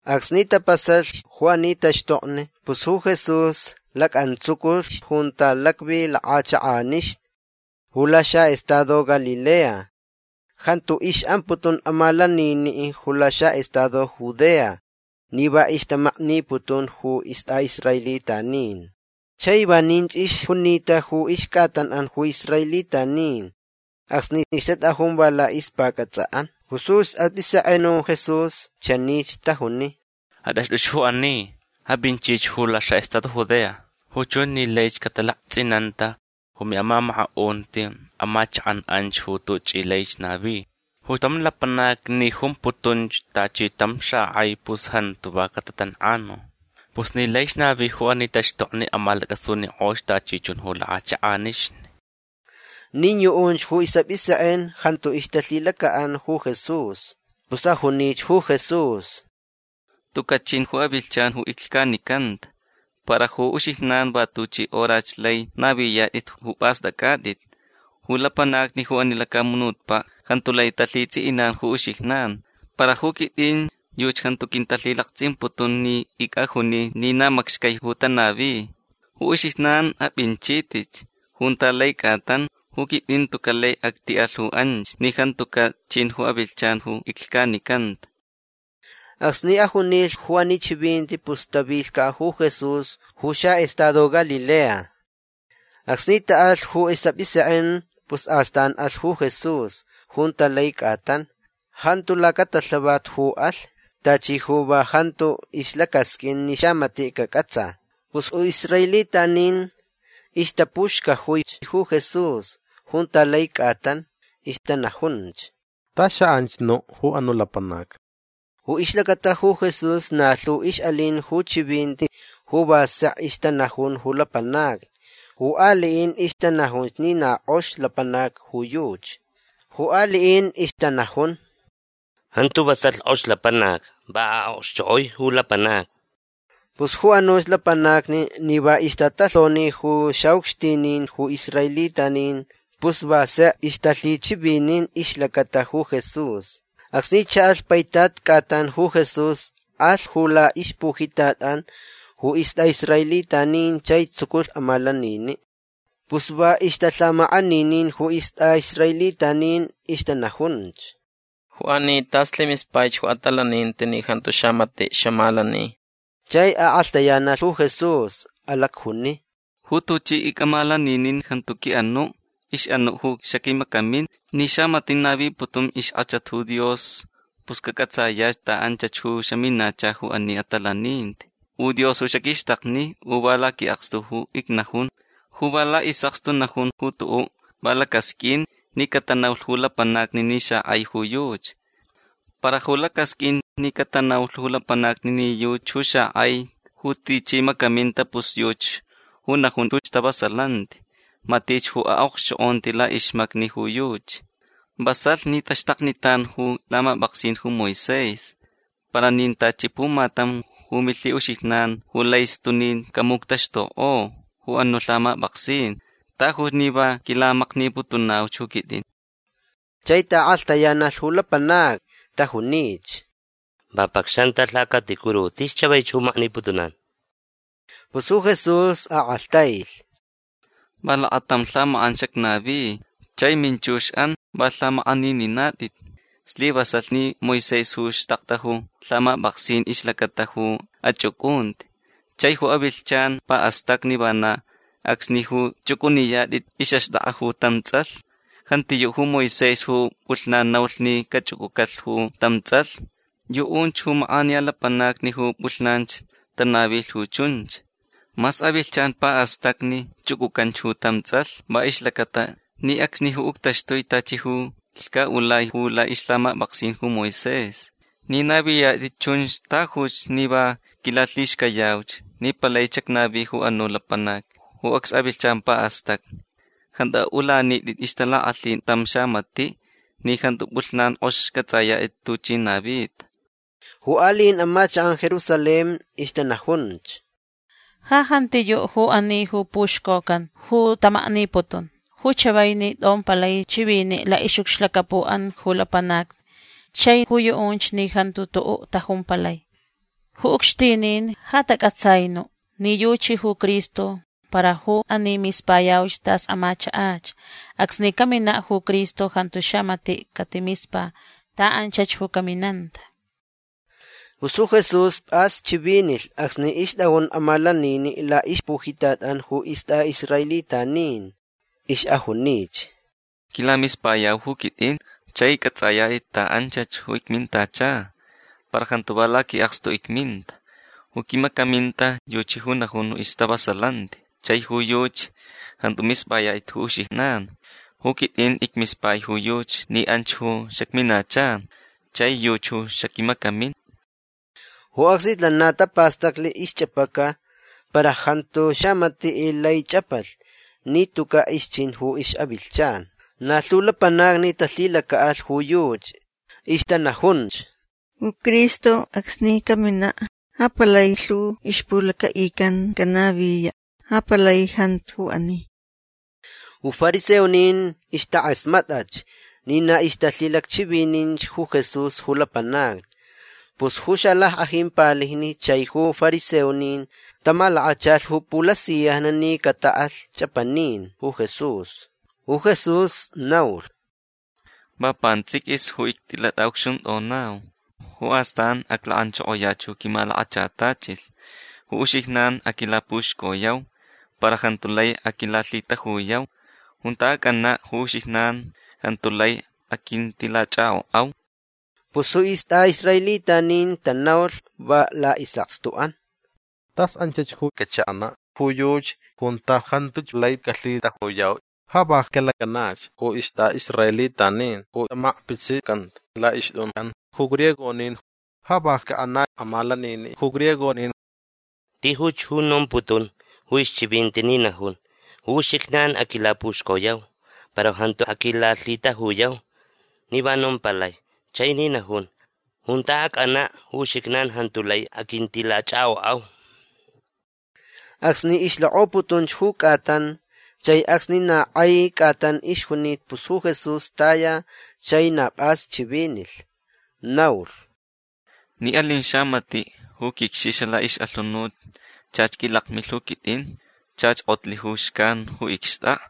Acsni tapasalhch ju ani taxtokni pus ju Jesús lacʼantsuculhch junta lacvi lakʼachakʼanixni ju laxaʼestado Galilea. Jantu ixʼamputun amalaniniʼ ju laxaʼestado Judea ni va ixtamakniputun ju istʼaʼisraelitanin. Chai vaninch ixjunita ju ixcʼatanʼan ju israelitanin acsni ixtatʼajun va laʼixpacʼatsʼaʼan. Pus ju isʼapʼisekʼen ju Jesús chanich tajuni: ―Atʼaxtʼuch ju ani. Apʼinchich ju laxaʼestado Judea. Ju chunch ni laich catalaktsʼinanta ju miʼamamakaʼunti amachakʼan anch ju tuchʼi laich navi. Ju tam lapanac ni jumputunch tachi tam xakʼai pus jantu va catatankʼanu. Pus ni laich navi ju ani taxtokni amalacʼasunikʼoch tachi chun ju lakʼachakʼanixni. Nin yuʼunch ju isʼapʼisekʼen jantu ixtalhilacaʼan ju Jesús. Pus ajunich ju Jesús: ―Tucaʼ chin ju avilhchan ju iclhcanicanta. Para ju uxijnan va tuchi horach lai naviyatʼit ju pʼastʼacʼatʼit. Ju lapanacni ju ani lacamunutpaʼ jantu lai talhitsʼiʼinan ju uxijnan. Para ju quitʼin yuchi jantu quintalhilaktsʼimputun ni icʼajuni ni na macxcai ju tanavi. Ju uxijnan apʼinchitʼitch junta lai cʼatan. Ju quitʼin tucaʼ lai actiʼalh ju anch ni jantucaʼ chin ju avilhchan ju iclhcanicanta. Acsni ajunilh ju ani chivinti pus tavilhcaʼ ju Jesús ju xaʼestado Galilea. Acsni taʼalh ju isʼapʼisekʼen pus astan alh ju Jesús junta lai cʼatan. Jantu lacatalhavat ju alh. Tachi ju va jantu ixlacasqʼuin ni xamatiʼ cacʼatsa. Pus ju israelitanin ixtapuxcajuich ju Jesús junta lai cʼatan. Ixtanajunch: ―Ta xaʼanch nuʼ ju anuʼ lapanac. Ju ixlacata ju Jesús na lhu ixʼalin ju chivinti ju va sek ixtanajun ju lapanacni. Ju aliʼin ixtanajunch ni na kʼox lapanac ju yuchi. Ju aliʼin ixtanajun: ―Jantu vasalh kʼox lapanac. Va aʼokxchokʼoi ju lapanacni. Pus ju anuch lapanacni ni va ixtatalhonich ju xaʼucxtinin ju israelitanin pus va sek ixtalhichivinin ixlacata ju Jesús. Acsni chaʼalh paitat cʼatan ju Jesús alh ju laʼixpujitatʼan ju istʼaʼisraelitanin chai tsuculh amalaniniʼ. Pus va ixtalhamakʼaninin ju istʼaʼisraelitanin. Ixtanajunch: ―Ju ani tas lhimispaich ju atalaninti ni jantu xamatiʼ xamalani. Chai akʼalhtayanalh ju Jesús. Alacjuni: ―Ju tuchi icʼamalaninin jantu quiʼanuʼ. Ixʼanuʼ ju xaquimacamin. Ni xamatiʼ naviputun ixkʼachat ju Dios pus cacʼatsayach ta anchach ju xaminacha ju ani atalaninti. U Dios ju xaquixtakni u va laquiʼakstu ju icnajun. Ju va laʼisʼakstu najun ju tuʼuʼ va lacasqʼuin ni catanaulh ju lapanacni ni xakʼai ju yuchi. Para ju lacasqʼuin ni catanaulh ju lapanacni ni yuchi ju xakʼai ju tichi macaminta pus yuchi ju najun ju stavasalanti. Matich ju aʼokxchokʼonti laʼixmacni ju yuchi. Vasalh ni taxtaknitan ju lhamapʼaksin ju Moisés. Para nin tachi pumatam ju milhiʼuxijnan ju lai stunin camuctaxtukʼo ju anuʼ lhamapʼaksin. Tajuch ni va quilamakniputunauch ju quitʼin. Chai taʼakʼalhtayanalh ju lapanacni. Tajunich: ―Va pʼacxantʼa lhacaticuru. Tis chavaich ju makniputunan. Pus ju Jesús akʼalhtailh: ―Va lakatam lhamakʼan xacnavi. Chai minchuxʼan va lhamakʼanininatʼit. Slivasalh ni Moisés ju xtakta ju lhamapʼaksin ixlacata ju achʼucʼunti. Chai ju avilhchan paʼastacni vana acsni ju chʼucʼuniyatʼit ixʼaxtʼakʼa ju tam tsʼalh. Jantiyuʼ ju Moisés ju pʼulhnan naulh ni cachʼucʼucalh ju tam tsʼalh. Yuʼunch ju makʼaniya lapanacni ju pʼulhnanch tanavilh ju chunch. Mas avilhchan paʼastacni chʼucʼucanch ju tam tsʼalh va ixlacata ni acsni ju uctaxtui tachi ju lhcaʼulai ju laʼixlhamapʼaksin ju Moisés. Ni naviyatʼit chunch tajuch ni va quilalhixcayauch ni palaich xacnavi ju anuʼ lapanac ju acs avilhchan paʼastacni. Jantu aʼulanitʼit ixtalakʼalhin tam xamatiʼ ni jantu pʼulhnan kʼox cʼatsʼayatʼit tuchi navita. Ju aliʼin amachakʼan Jerusalén ixtanajunch: ―Ja jantiyuʼ ju ani ju puxcocan ju tamakniputun. Ju chavai ni tʼompalai chiviniʼ laʼixʼucxlacapuʼan ju lapanacni. Chai ju yuʼunch ni jantu tuʼuʼ tajumpalai. Ju ucxtinin ja tacʼatsai nuʼ ni yuchi ju Cristo. Para ju ani mispayauch tas amachakʼach. Acsni caminaʼ ju Cristo jantu xamatiʼ catimispa ta anchach ju caminanta. Pus ju Jesús pʼas chivinilh acsni ixtʼajun amalaniniʼ laʼixpujitatʼan ju istʼaʼisraelitanin. Ixʼajunich: ―Quilamispayau ju quitʼin. Chai cʼatsʼayatʼit ta anchach ju icmintacha. Para jantu va laquiʼakstu icminta. Ju quimacaminta yuchi ju najun ju stavasalanti chai ju yuchi jantu mispʼayatʼit ju uxijnan. Ju quitʼin icmispai ju yuchi ni anch ju xacminacha. Chai yuchi ju xaquimacamin. Ju acsnich lana tapastaclich ixchʼapaca. Para jantu xamatiʼ lai chʼapalh ni tucaʼ ixchin ju ixʼavilhchan. Na lhu lapanacni talhilacaʼalh ju yuchi. Ixtanajunch: ―Ju Cristo acsni caminaʼ ja palai lhu ixpulacaʼican canaviyaʼ. Ja palai jantu ju ani. Ju fariseonin ixtakʼasmatʼach ni na ixtalhilacchivininch ju Jesús ju lapanacni. Pus ju xalackʼajin palijni chai ju fariseonin tamalakachalh ju pulasiyajni ni cataʼalh chʼapanin ju Jesús. Ju Jesús naulh: ―Va pantsʼiquis ju ictilatʼaʼucxuntʼonau. Ju astan aclakʼanchokoyach ju quimalakachatachilh. Ju uxijnan aquilapuxcoyau. Para jantu lai aquilalhitajuyau. Junta acʼanaʼ ju uxijnan jantu lai aquintilachʼakʼokʼau. Pus ju istʼaʼisraelitanin tanaulh va laʼisʼakstuʼan: ―Tas anchach ju cachaʼanaʼ ju yuchi junta jantuch lai calhitajuyau. Ja va calakʼanach ju istʼaʼisraelitanin ju amakpitsicanta laʼixtʼunʼan ju griegonin. Ja va caʼanaʼ amalaniniʼ ju griegonin. Tijuch ju nomputun ju ixchivinti ni najun: “Ju uxijnan aquilapuxcoyau para jantu aquilalhitajuyau”. Ni va nompalai. Chai ni najun: “Junta acʼanaʼ ju uxijnan jantu lai aquintilachʼakʼokʼau”. Acsni ixlakʼoputunch ju cʼatan chai acsni na kʼai cʼatan ixjunita pus ju Jesús taya chai na pʼas chivinilh. Naulh: ―Ni alin xamatiʼ ju quicxixa laʼixʼalhunut chach quilakmilh ju quitʼin. Chach kʼotlh ju xcan ju icxtʼakʼa.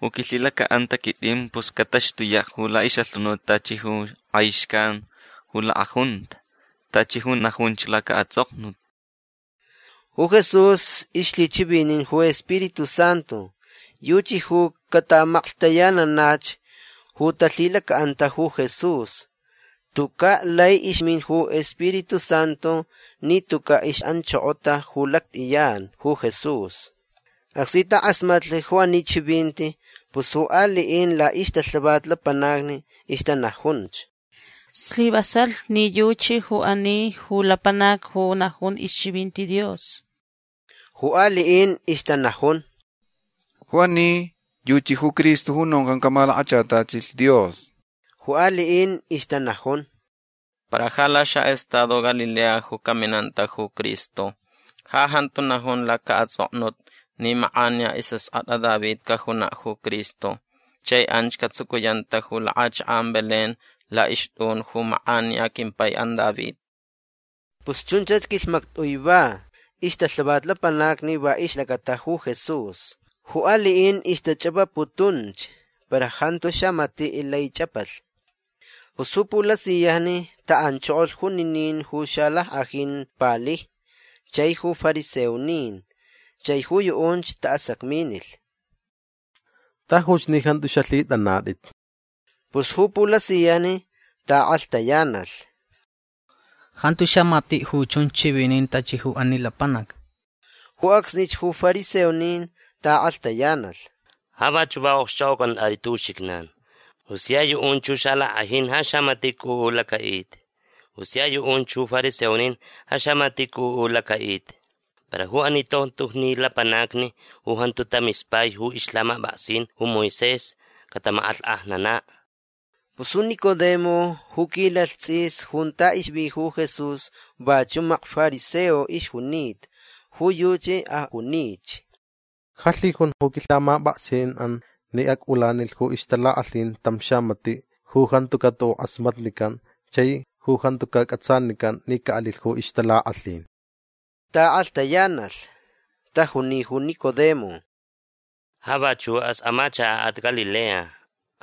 Ju quilhilacaʼanta quitʼin pus cataxtuyaʼ ju laʼixʼalhunut tachi kʼai xcan ju lakʼajunta. Tachi ju najunch lacaʼatsʼoknut. Ju Jesús ixlhichivinin ju Spiritu Santu. Yuchi ju cataʼamaklhtayananach ju talhilacaʼanta ju Jesús. Tucaʼ lai ixmin ju Spiritu Santu ni tucaʼ ixʼanchokota ju lactʼiyan ju Jesús. Acsni takʼasmatlh ju ani chivinti pus ju aliʼin laʼixtalhavat lapanacni ixtanajunch: ―Slivasalh ni yuchi ju ani ju lapanac ju najun ixchivinti Dios. Ju aliʼin ixtanajun: ―Ju ani yuchi ju Cristo ju noncan camalakachatachilh Dios. Ju aliʼin ixtanajun: ―Para ja laxaʼestado Galilea ju caminanta ju Cristo. Ja jantu najun lacaʼatsʼoknut ni makʼaniya isʼaskʼatʼa David cajunaʼ ju Cristo. Chai anch catsucuyanta ju lakʼachakʼan Belén laʼixtʼun ju makʼaniya quimpaiʼan David. Pus chunchach quilhmactʼui va ixtalhavat lapanacni va ixlacata ju Jesús. Ju aliʼin ixtachʼapaputunch. Para jantu xamatiʼ lai chʼapalh. Pus ju pulasiyajni taʼanchokolh juninin ju xalackʼajin palijni chai ju fariseonin. Chai ju yuʼunch taʼasacminilh: ―Tajuch ni jantu xalhitʼanatʼit. Pus ju pulasiyajni taʼakʼalhtayanalh: ―Jantu xamatiʼ ju chunch chivinin tachi ju ani lapanac. Ju acsnich ju fariseonin taʼakʼalhtayanalh: ―Ja vachuʼ va okxchʼokʼocʼantʼatʼit ju uxijnan. Ju sia yuʼunch ju xalackʼajin ja xamatiʼ cʼuʼu lacaʼita. U sia yuʼunch ju fariseonin ja xamatiʼ cʼuʼu ju lacaʼita. Para ju ani tontojni lapanacni ju jantu tamispai ju ixlhamapʼaksin ju Moisés catamakʼalhkʼajnanaʼ. Pus ju Nicodemo ju quilalh tsʼis junta ixvi ju Jesús vachuʼ makfariseo ixjunita. Ju yuchi ajunich: ―Ja lhijun ju quilhamapʼaksinʼan ni acʼulanilh ju ixtalakʼalhin tam xamatiʼ ju jantucaʼ tuʼuʼ kʼasmatnican chai ju jantucaʼ cʼatsanican ni caʼalilh ju ixtalakʼalhin. Taʼakʼalhtayanalh. Tajuni ju Nicodemo: ―Ja vachuʼas amachakaʼat Galilea.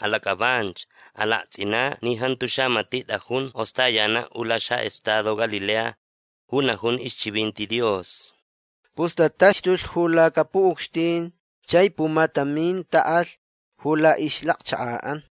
Alacʼavanch. Alaktsʼinaʼ ni jantu xamatiʼ tʼajun kʼostayanaʼ ju laxaʼestado Galilea ju najun ixchivinti Dios. Pus tataxtulh ju lacapuʼucxtin chai pumatamin taʼalhch ju laʼixlacchakaʼan.